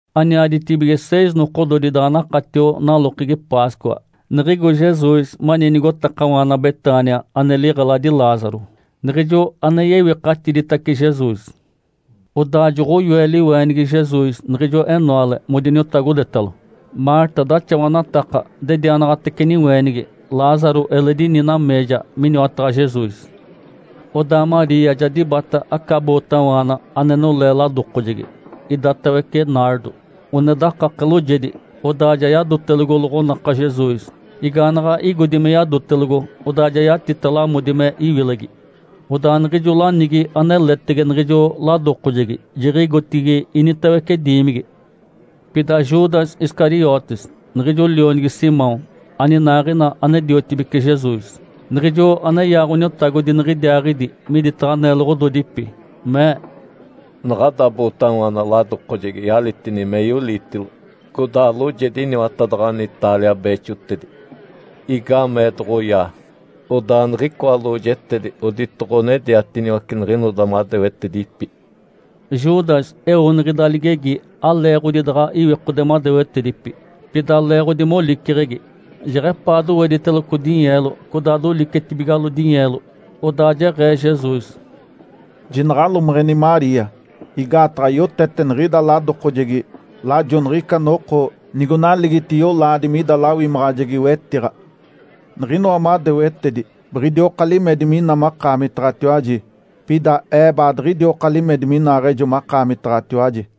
Aniaditibige seis nokododi daɡ̶a nakatio nalokegi Páscoa, niɡ̶igo Jesus mani nigotakawaana Betânia ane liɡ̶eladi Lázaro, niɡ̶ijo ane yewikatiditace Jesus. Odaa joɡ̶oyoe liweenigi Jesus niɡ̶ijo enoale modiniotagodetalo. Marta daxawanataka dedianaɡ̶atece niweenigi. Lázaro eledi ini nameeja miniwataɡ̶a Jesus. Odaa Maria ja dibata aca bootawaana ane nolee ladokojegi, idatawece “nardo”, one dakake loojedi. Odaa ja yadotelogo loɡ̶onaka Jesus, igaanaɡ̶a igodi me yadotelogo, odaa yatita lamodi me iwilegi. Odaa niɡ̶ijo lanigi aneletege niɡ̶ijo ladokojegi jiɡ̶igotigi initawece diimigi. Pida Judas Iscariotes, niɡ̶ijo lionigi Simão, aninaaɡ̶ina ane-diotibece Jesus, niɡ̶ijo aneyaa Ǥoniotagodi niɡ̶idiaaɡ̶idi miditaɡ̶a neloɡ̶ododipi, mee, “Naɡ̶ada bootawaana ladokojegi yalitini meyo-liitilo, codaa loojedi iniwatadaɡ̶ani taalia beexotedi. Igaamee doɡ̶oyaa, odaa niɡ̶icoa lojetedi oditoɡ̶onediatiniwace niɡ̶inoda madewetedipi?” Judas eo niɡ̶ida ligegi aleeɡ̶odi daɡ̶a iwikode madewetedipi, pida leeɡ̶odi moliceɡ̶egi. Jeɡ̶epaa dowediteloco dinyeelo, codaa dolicetibigalo dinyeelo. Odaa jeɡ̶ee Jesus, “Jinaɡ̶alomeɡ̶eni Maria! Igaataɡ̶a yotete niɡ̶ida ladokojegi lajo niɡ̶ica noko nigonaligiti yolaadi mida lawimaɡ̶ajegi-wetiɡ̶a. Niɡ̶inoa madewetedi biɡ̶idioka limedi mina makaamitaɡ̶atiwaji, pida Ee baadiɡ̶idioka limedi minaaɡ̶ejo makaamitaɡ̶atiwaji”.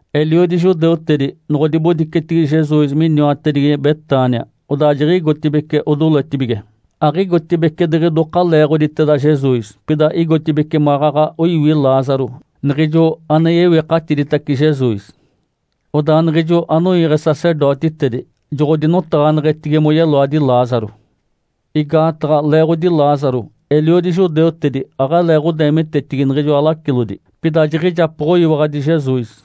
Eliodi judeutedi, noɡ̶odibodicetigi Jesus miniwatedigi Betânia, odaa jiɡ̶igotibeci odoletibige. Aɡ̶igotibeci diɡ̶ijoka leeɡ̶oditeda Jesus, pida igotibeci maɡ̶aɡ̶a oiwi Lázaro, niɡ̶ijo ane yewikatiditace Jesus. Odaa niɡ̶ijo anoiiɡ̶e sacerdotitedi joɡ̶odinotaɡ̶aneɡ̶etigi moyeloadi Lázaro. Igaataɡ̶a, leeɡ̶odi Lázaro, eliodi judeutedi aɡ̶aleeɡ̶odeemitetigi niɡ̶ijoa lacilodi, pida jiɡ̶ijapoɡ̶oyiwaɡ̶adi Jesus.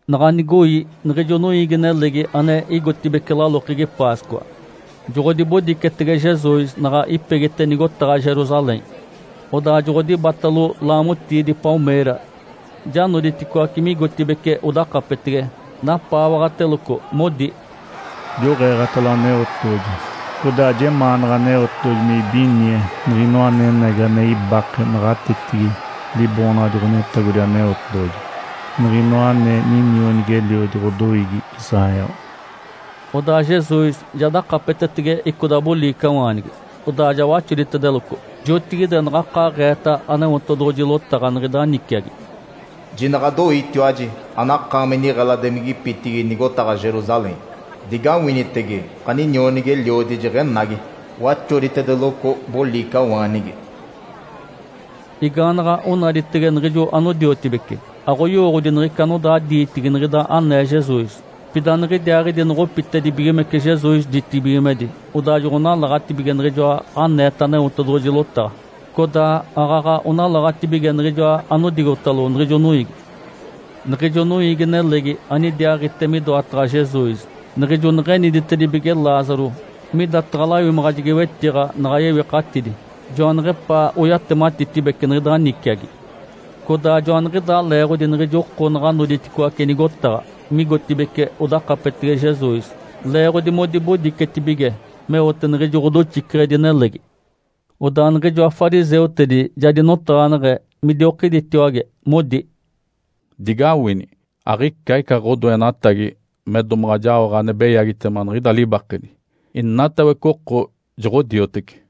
Naɡ̶a nigoi, niɡ̶ijo noiigi-nelegi ane igotibeci lalokegi Páscoa, joɡ̶odibodicetege Jesus naɡ̶a ipegite nigotaɡ̶a Jerusalém. Odaa joɡ̶odibatalo laamotiidi “palmeira”, ja noditicoaci migotibeci odakapetege, napaawaɡ̶ateloco, modi, “Joɡ̶eeɡ̶atalo Aneotedoɡ̶oji. Codaa jemaanaɡ̶a Aneotedoɡ̶oji me ibinie Niɡ̶inoa anenagi ane ibake naɡ̶atetigi Liboonaɡ̶adi Ǥoniotagodi Aneotedoɡ̶oji, Niɡ̶inoa ane ninionigi-eliodi ɡ̶odoiigi Israel”. Odaa Jesus ja dakapetetege icoda boliicawaanigi, odaa ja waxoditedeloco. Jotigide naɡ̶akaaɡ̶eeta Aneotedoɡ̶oji lotaɡ̶a niɡ̶ida niciagi, “Jinaɡ̶adoiitiwaji, anakaami niɡ̶eladimigipitigi nigotaɡ̶a Jerusalém. Digawinitege! Ǥaninionigi-eliodi jeɡ̶enagi, waxoditedeloco boliicawaanigi”. Igaanaɡ̶a onaditege niɡ̶ijo anodiotibece, aɡ̶oyowooɡ̶odi niɡ̶ica anodaa diitigi niɡ̶ida anee Jesus. Pida niɡ̶idiaaɡ̶idi noɡ̶opitedibigimece Jesus ditibigimedi, odaa joɡ̶onalaɡ̶atibige niɡ̶ijoa aneeta Aneotedoɡ̶oji lotaɡ̶a, codaa aaɡ̶aɡ̶a onalaɡ̶atibige niɡ̶ijoa anodigotalo niɡ̶ijo noiigi. Niɡ̶ijo noiigi-nelegi anidiaaɡ̶ite midoataɡ̶a Jesus niɡ̶ijo neɡ̶eniditedibige Lázaro midataɡ̶a lawimaɡ̶ajegi-wetiɡ̶a naɡ̶a yewikatidi, joaneɡ̶epaa oyatematitibece niɡ̶ida niciagi. Codaa joaniɡ̶idaa leeɡ̶odi niɡ̶ijo oko naɡ̶a noditicoaci nigotaɡ̶a, migotibeci odakapetege Jesus, leeɡ̶odi modibodicetibige meote niɡ̶ijo ɡ̶odoxiceɡ̶edi nelegi. Odaa niɡ̶ijoa fariseutedi ja dinotaɡ̶aneɡ̶e midiokiditiwage, modi, “Digawini! Aɡ̶ica ica ɡ̶odoenatagi me domaɡ̶a jaoɡ̶a ane beyagitema niɡ̶ida libakedi. Inatawece oko joɡ̶odiotece.”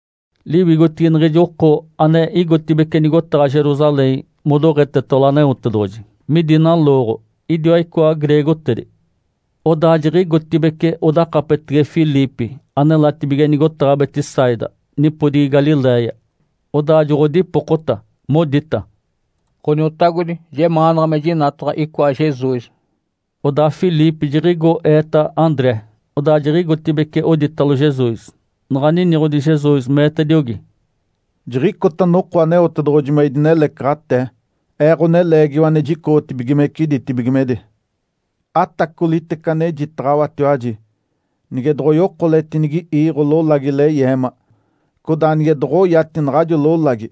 Liwigotigi niɡ̶ijo oko ane igotibeci nigotaɡ̶a Jerusalém modoɡ̶etetalo Aneotedoɡ̶oji midi nalooɡ̶o, idiwa icoa greegotedi. Odaa jiɡ̶igotibeci odakapetege Filipe, anelatibige nigotaɡ̶a Betsaida, nipodigi Galiléia. Odaa joɡ̶odipokota modita, “Ǥoniotagodi, jemaanaɡ̶a me jinataɡ̶a icoa Jesus”. Odaa Filipe jiɡ̶igo eeta André, odaa jiɡ̶igotibeci oditalo Jesus. Naɡ̶a niniɡ̶odi Jesus, meetediogi, “Jiɡ̶icota noko Aneotedoɡ̶oji me idinelecaɡ̶atee, Ee, Ǥoneleegiwa ane jicoɡ̶otibigimece ditibigimedi. Atacolitece anejitaɡ̶awatiwaji! Nige doɡ̶oyokoletinigi iiɡ̶o lolagi leyeema, codaa nige doɡ̶oyati naɡ̶ajo lolagi,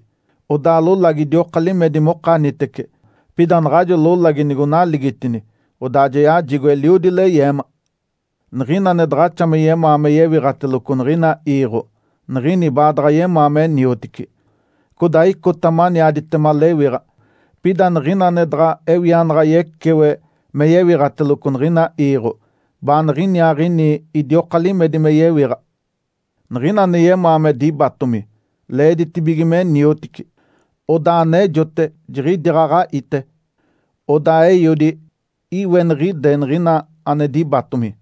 odaa lolagi idioka limedi mokanitece. Pida naɡ̶ajo lolagi nigonaligitini, odaa ja yajigo eliodi leyeema. Niɡ̶ina ane daɡ̶axa me yemaa me yewiɡ̶ateloco niɡ̶ina iiɡ̶o, niɡ̶ini baadaɡ̶a yemaa me niotici, codaa icota maniaditema lewiɡ̶a. Pida niɡ̶ina ane daɡ̶a ewianaɡ̶a yecewe me yewiɡ̶ateloco niɡ̶ina iiɡ̶o, baaniɡ̶iniaaɡ̶ini idioka limedi me yewiɡ̶a. Niɡ̶ina ane yemaa me dibatomi, leeditibige me niotici. Odaa anejote jiɡ̶idiaaɡ̶aɡ̶a ite. Odaa Eiodi iweniɡ̶ide niɡ̶ina ane dibatomi”.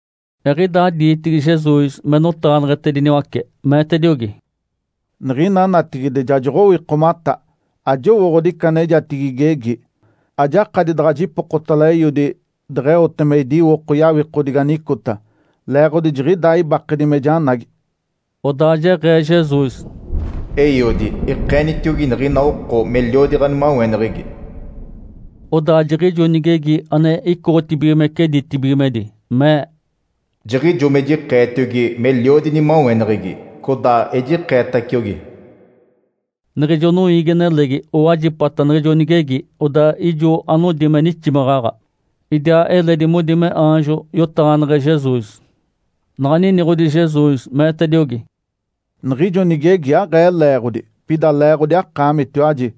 Eɡ̶idaa diitigi Jesus me notaɡ̶aneɡ̶etediniwace, meetediogi, “Niɡ̶ina natigide ja joɡ̶owikomata. Ajowooɡ̶odi ica anejatigi igegi. Ajakadi daɡ̶a jipokotalo Eiodi deɡ̶eote me idiwoko yawikodigi anicota, leeɡ̶odi jiɡ̶idaa ibakedi me janagi”. Odaa jeɡ̶ee Jesus, “Eiodi, ikeenitiogi niɡ̶ina oko meliodi ɡ̶animaweneɡ̶egi”. Odaa jiɡ̶ijo nigegi ane icoɡ̶otibigimece ditibigimedi, mee, “Jiɡ̶ijo me jikeetiogi meliodi inimaweneɡ̶egi, codaa ejikeetaciogi”. Niɡ̶ijo noiigi-nelegi owajipata niɡ̶ijo nigegi. Odaa ijo anodi me niximaɡ̶aɡ̶a. Idiaa eledi modi me aanjo yotaɡ̶aneɡ̶e Jesus. Naɡ̶a niniɡ̶odi Jesus, meetediogi, “Niɡ̶ijo nigegi aɡ̶ee leeɡ̶odi, pida leeɡ̶odi akaamitiwaji.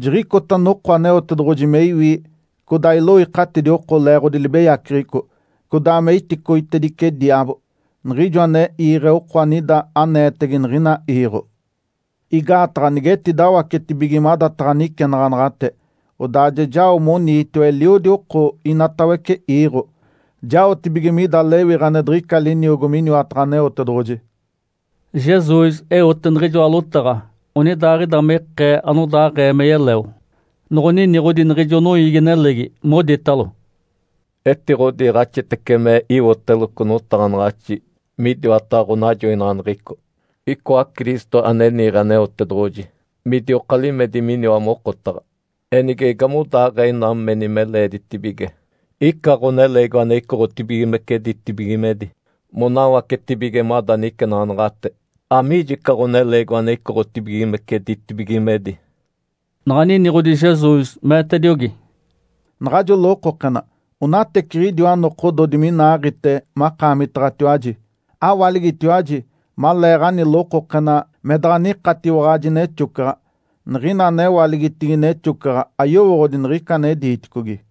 Jiɡ̶icota noko Aneotedoɡ̶oji me iwi codaa iloikatidi oko leeɡ̶odi libeyaceɡ̶eco, codaa me iticoitedice diaabo, niɡ̶ijo ane iiɡ̶e oko anida aneetege niɡ̶ina iiɡ̶o. Igaataɡ̶a nigetidawacetibige madataɡ̶a nicenaɡ̶anaɡ̶ate, odaa ja jao moniitiwa eliodi oko inatawece iiɡ̶o, jaotibige mida lewiɡ̶a ane diɡ̶ica liniogo miniwataɡ̶a Aneotedoɡ̶oji.” Jesus eote niɡ̶ijoa lotaɡ̶a onidaaɡ̶ida me ikee anodaaɡ̶ee me yeleo. Noɡ̶oniniɡ̶odi niɡ̶ijo noiigi-nelegi, moditalo, “Etiɡ̶odiiɡ̶axitece me iwoteloco notaɡ̶anaɡ̶axi midiwataɡ̶a ɡ̶onajoinaɡ̶aneɡ̶eco, icoa Cristo, ane niiɡ̶e Aneotedoɡ̶oji, midioka limedi miniwa mokotaɡ̶a. Enige igamodaaɡ̶ee ina meni me leeditibige ica Ǥoneleegiwa ane icoɡ̶otibigimece ditibigimedi monawacetibige mada nicenaɡ̶anaɡ̶ate? Amiijo ica Ǥoneleegiwa ane icoɡ̶otibigimece ditibigimedi?” Naɡ̶a niniɡ̶odi Jesus, meetediogi, “Naɡ̶ajo lokokena onateciɡ̶idiwa nokododi minaaɡ̶ite makaamitaɡ̶atiwaji. Awaligitiwaji maleeɡ̶ani lokokena me daɡ̶a nikatiwaɡ̶aji nexocaɡ̶a. Niɡ̶ina anewaligitigi nexocaɡ̶a ayowooɡ̶odi niɡ̶ica ane diiticogi.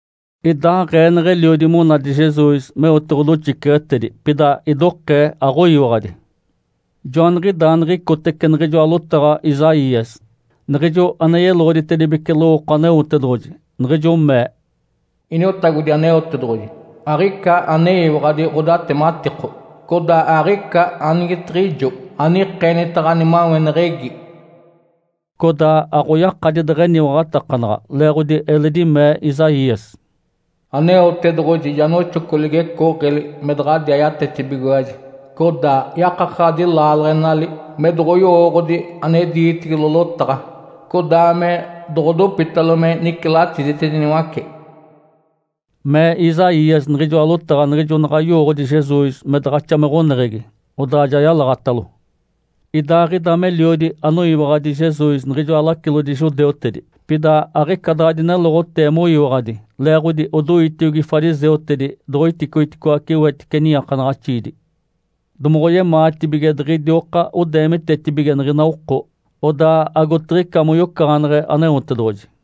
Idaaɡ̶ee neɡ̶eliodi monadi Jesus meote ɡ̶odoxiceɡ̶etedi, pida idokee aɡ̶oyiwaɡ̶adi. Joaniɡ̶idaa niɡ̶icotece niɡ̶ijoa lotaɡ̶a Isaías, niɡ̶ijo ane yeloɡ̶oditedibece lowooko Aneotedoɡ̶oji, niɡ̶ijo mee, “Iniotagodi Aneotedoɡ̶oji. Aɡ̶ica aneyiwaɡ̶adi ɡ̶odatematiko. Codaa aɡ̶ica anigetiɡ̶ijo anikeenita ɡ̶animaweneɡ̶egi.” Codaa aɡ̶oyakadi deɡ̶eniwaɡ̶atakanaɡ̶a, leeɡ̶odi eledi mee Isaías, “Aneotedoɡ̶oji ja noxoco ligecooɡ̶eli me daɡ̶adiaa yatetibigiwaji, codaa yakakaɡ̶adi laaleɡ̶enali me doɡ̶oyowooɡ̶odi ane diitigilo lotaɡ̶a, codaa me doɡ̶odopitalo me nicilatiditediniwace.” Mee Isaías niɡ̶ijoa lotaɡ̶a niɡ̶ijo naɡ̶a yowooɡ̶odi Jesus me daɡ̶axa me ɡ̶oneɡ̶egi, odaa ja yalaɡ̶atalo. Idaaɡ̶ida meliodi anoyiwaɡ̶adi Jesus niɡ̶ijoa lacilodi judeutedi. Pida aɡ̶ica daɡ̶a dineloɡ̶otee moyiwaɡ̶adi leeɡ̶odi odoitiogi fariseutedi doɡ̶oiticogiticoace wetice niiakanaɡ̶axiidi. Domoɡ̶oyemaatibige diɡ̶idioka odeemitetibige niɡ̶ina oko. Odaa agotiɡ̶ica moyocaɡ̶aneɡ̶e Aneotedoɡ̶oji.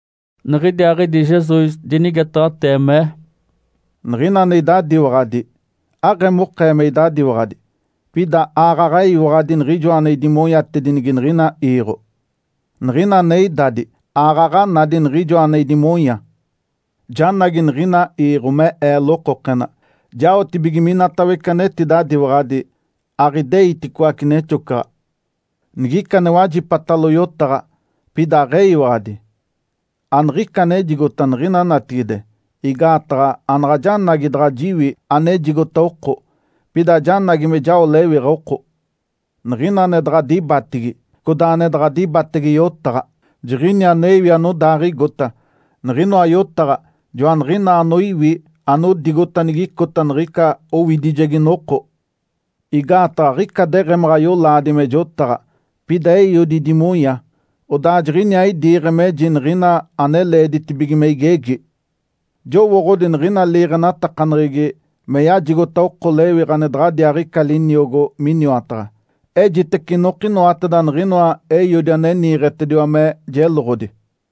Niɡ̶idiaaɡ̶idi Jesus dinigetaɡ̶atee, mee, “Niɡ̶ina ane idadiwaɡ̶adi, aɡ̶emokee me idadiwaɡ̶adi, pida aaɡ̶aɡ̶a eyiwaɡ̶adi Niɡ̶ijoa ane idimonyatedinigi niɡ̶ina iiɡ̶o. Niɡ̶ina ane idadi aaɡ̶aɡ̶a nadi Niɡ̶ijoa ane idimonya. Janagi niɡ̶ina iiɡ̶o me Ee lokokena, jaotibige minatawece anetidadiwaɡ̶adi aɡ̶ideiticoace nexocaɡ̶a. Nigica ane wajipatalo yotaɡ̶a, pida aɡ̶eyiwaɡ̶adi, aniɡ̶ica anejigota niɡ̶ina natigide. Igaataɡ̶a anaɡ̶a janagi daɡ̶a jiwi anejigota oko, pida janagi me jao lewiɡ̶a oko. Niɡ̶ina ane daɡ̶a dibatigi, codaa ane daɡ̶a dibatege yotaɡ̶a, jiɡ̶ini ane iwi anodaaɡ̶igota. Niɡ̶inoa yotaɡ̶a joaniɡ̶inaa anoiwi anodigota nigicota niɡ̶ica owidijegi noko. Igaataɡ̶a aɡ̶ica deɡ̶emaɡ̶a yolaadi me jotaɡ̶a, pida Eiodi idimonya. Odaa jiɡ̶iniaa idiiɡ̶e meji niɡ̶ina ane leeditibige me igegi. Jowooɡ̶odi niɡ̶ina liiɡ̶enatakaneɡ̶egi me yajigota oko lewiɡ̶a ane daɡ̶adiaaɡ̶ica liniogo miniwataɡ̶a. Ejitece inokinoateda niɡ̶inoa Eiodi ane niiɡ̶etediwa me jeloɡ̶odi”.